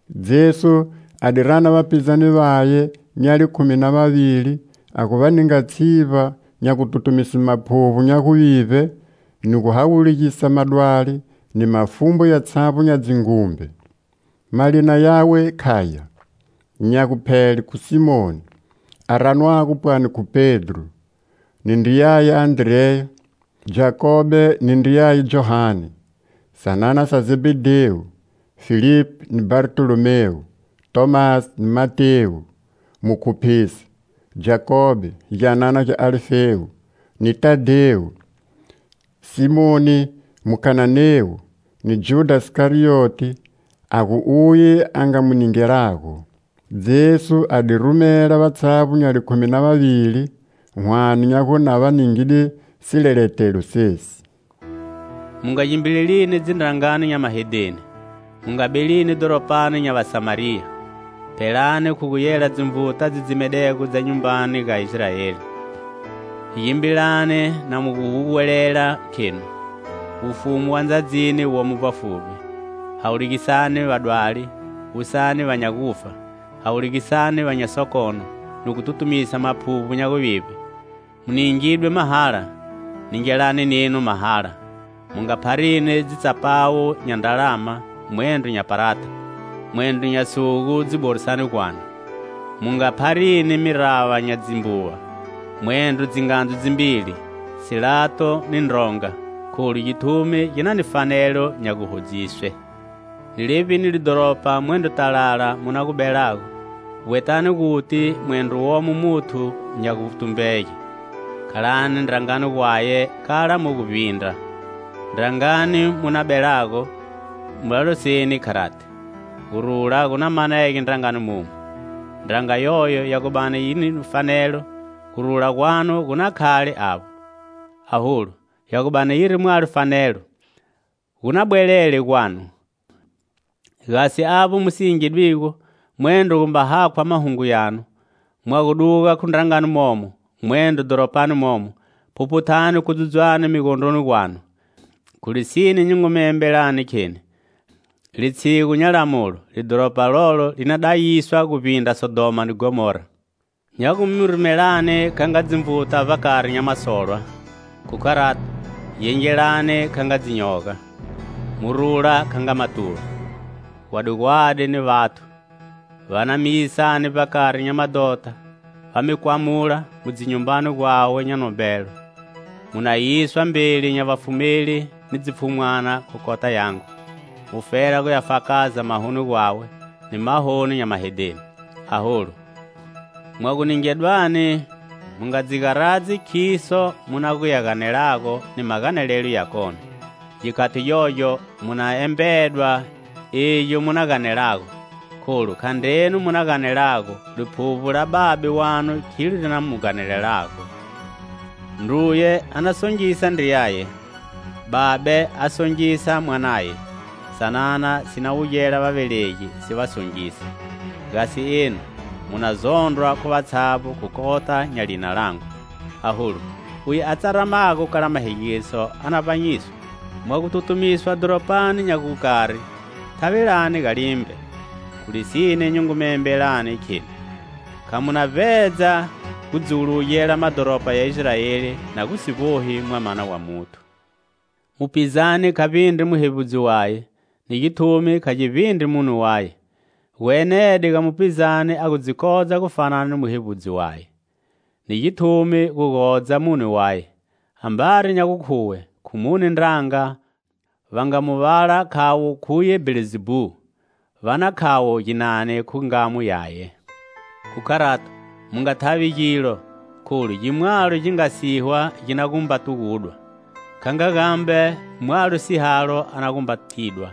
Jesu a di rana vapizane, nya likhumi na vavili a gu va ninga tshivba nya gututumise maphuvbo nya guvivbe ni gu hawulugisa madwali ni mafumbu yatshavbo nya dzingumbe. Malina yawe khaya: Nya guphele khu Simoni, a ranwago pwani khu Pedro, ni ndriyaye Andreya; Jakobe ni ndriyaye Johane, sanana sa Zebhedhewu; Filipi ni Bhartolomewu; Tomasi ni Matewu, mukhuphisi; Jakobe, gyanana gya Alifewu, ni Tadhewu; Simoni Mukananewu, ni Judha Sikarioti, a gu uye a nga mu ningelago. Jesu a di rumela vatshavbo nya likhumi na vavili, whane nya gu na va ningide sileletelo sesi. "Mu nga gimbilelini dzindrangani nya mahedheni, mu nga belini dhoropani nya Vasamariya. Phelani khu gu yela dzinvuta dzi dzimedego dza nyumbani ga Israeli. Gimbilani na mu guhuwelela, khenu: 'Wufumu wa ndzadzini womo vbafuvbi.' Hawulugisani vadwali, wusani va nya gufa; hawulugisani va nya sokono ni gu tutumisa maphuvbo nya guvivbe. Mu ningidwe mahala; ningelani nenu mahala. Mu nga pharini dzitsapawu nya ndralama, mwendro nya parata, mwendro nya sugu dziborisani gwanu; mu nga pharini mirava nya dzimbuva, mwendro dzingandzu dzimbili, silato ni ndronga; kholu githumi gi na ni fanelo nya guhodziswe. Ni levbi lidhoropa mwendro talala mu na gu belago, vbwetani guti mwendro womo muthu nya gutumbege. Khalani ndrangani gwaye kala mu gu vbindra. Ndrangani mu na gu belago, va loseni kharati: 'Gurula gu na manege ndrangani mamu.' Ndranga yoyo ya gu bani yiri ni fanelo, gurula gwanu gu na khale avbo; aholu ya gu bani yiri mwalo fanelo, gu na bwelele gwanu. Gasi avbo mu si yingedwigo, mwendro gumba hakhwa mahungo yanu, mwa gu duga khu ndrangani momo, mwendro dhoropani momo, phuphuthani kudzudzwane migondroni gwanu. Khu lisine nyi ngu mi embelani, kheni litshigu nya lamulo, lidhoropa lolo li na dayiswa guvbindra Sodhoma ni Ghomora. "Nya gu mu rumelani kha nga dzinvuta vbakari nya masolwa; khu kharato, gengelani kha nga dzinyoga; mu rula kha nga matuva. Gwadigwadi ni vathu! Va na mi yisani vbakari nya madhota, va mi kwamula mu dzinyumbani gwawe nya nombelo; mu na yiswa mbeli nya vafumeli ni dzipfhumwana khu kota yangu, mufela guya fakaza mahoni gwawe ni mahoni nya mahedheni. Aholu, mwa gu ningedwani, mu nga dzi garadzi khiso mu na gu ya ganelago ni maganelelo ya kone; gikhati gyogyo mu na embedwa igyo mu na ganelago. Kholu khandrenu mu na ganelago, Liphuvbo la Babe wanu khilo li na mi ganelelago. Ndruye a na songisa ndriyaye; babe a songisa mwanaye; sanana si na wugela vavelegi si va songisa. Gasi enu mu na zondrwa khu vatshavbo khu kota nya lina langu. Aholu uye a tsaramago kala mahegiso a na vbanyiswa. Mwa gu tutumiswa dhoropani nya gukari, thavelani ga limbe. Khu lisine nyi ngu mi embelani, kheni: kha mu na vbedza gu dzuwulugela madhoropa ya Israeli na si gu vbohi Mwamana wa Muthu. "Mupizane kha vbindri muhevbudzi waye, ni githumi kha gi vbindri mune yaye. Gu enede ga mupizane a gu dzi kodza gufana ni muhevbudzi waye, ni githumi gu godza mune waye. Ambari nya gukhuwe khu mune ndranga va nga mu vala khavo khuye Bhelzebhu, va na khavo ginani khu ngamo yaye? "Khu kharato, mu nga thavi gilo, kholu gi mwalo gi nga sihwa gi na gumba tugudwa; kha nga gambe, mwalo sihalo a na gumba tidwa.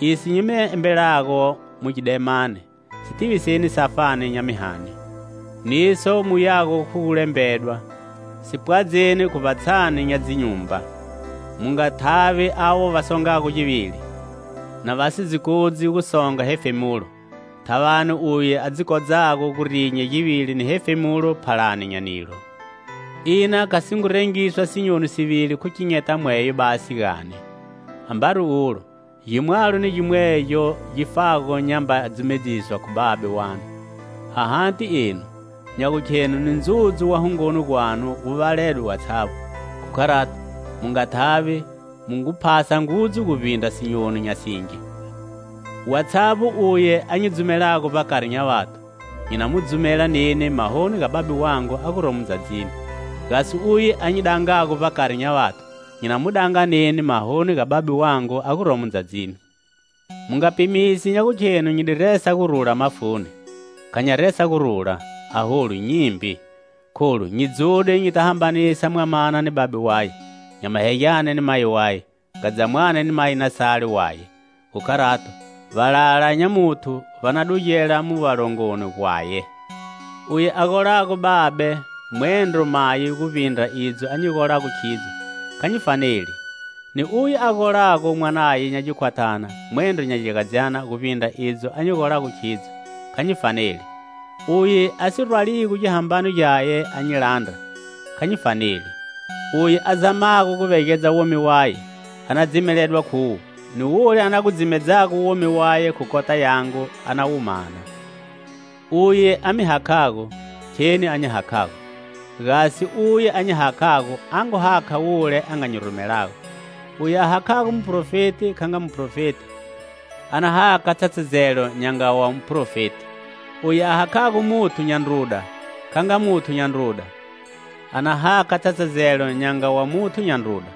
Iso nyi mi embelago mu gidemani, si tiviseni safani nya mihani; niso muyago khu gu lembedwa, si pwadzeni khu vbatshani nya dzinyumba. Mu nga thavi avo va songago givili, na va si dzi kodzi gu songa hefemulo. Thavani, uye a dzi kodzago gu rinya givili ni hefemulo phalani nya nilo. Ina kha si ngu rengiswa sinyoni sivili khu kinyeta mweyo basi, gani? Ambari ulo gimwalo ni gimwegyo gi fago nyamba dzumedziswa khu Babe wanu! Ahati enu, nya gukhenu ni ndzudzu wa hungoni gwanu wu valedwe watshavbo! Khu kharato, mu nga thavi mu ngu phasa ngudzu guvbindra sinyoni nya singi. "Watshavbo uye a nyi dzumelago vbakari nya vathu, nyi na mu dzumela neni mahoni ga Babe wangu a guromo ndzadzini. Gasi uye a nyi dangago vbakari nya vathu, nyi na mu danga neni mahoni ga Babe wangu a guromo ndzadzini. "Mu nga pimisi nya gukhenu nyi di resa gurula mafuni; kha nya resa gurula, aholu nyimbi. Kholu nyi dzude nyita hambanisa mwamana ni babe waye, nyamahegyane ni mayi waye, ngadzamwane ni mayinasale waye. Khu kharato, valala nya muthu va na dugela mu valongoni gwaye. "Uye a golago babe mwendro mayi guvbindra idzo a nyi golago khidzo, kha nyi faneli. Ni uye a golago mwanaye nya gikhwathana mwendro nya gyagadzyana guvbindra idzo a nyi golago khidzo, kha nyi faneli. Uye a si rwaligo gihambano gyaye a nyi landra, kha nyi faneli. Uye a zamago gu vegedza womi waye, a na dzimeledwa khuwo, ni wule a na gu dzimedzago womi waye khu kota yangu a na wu mana. "Uye a mi hakhago, kheni a nyi hakhago; gasi uye a nyi hakhago a ngu hakha wule a nga nyi rumelago. Uye a hakhago muphrofeti kha nga muphrofeti, a na hakha tshatshazelo nya nga wa muphrofeti; uye a hakhago muthu nya ndruda kha nga muthu nya ndruda, a na hakha tshatshazelo nya nga wa muthu nya ndruda.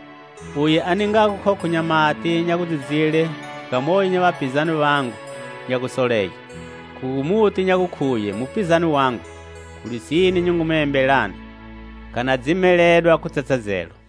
Uye a ningago khokho nya mati nya gudzidzile ga moyo nya vapizane vangu nya gusolege, khu gu mu ti nya gukhuye mupizane wangu, khu lisine nyi ngu mi embelani, kha na dzimeledwa khu tshatshazelo."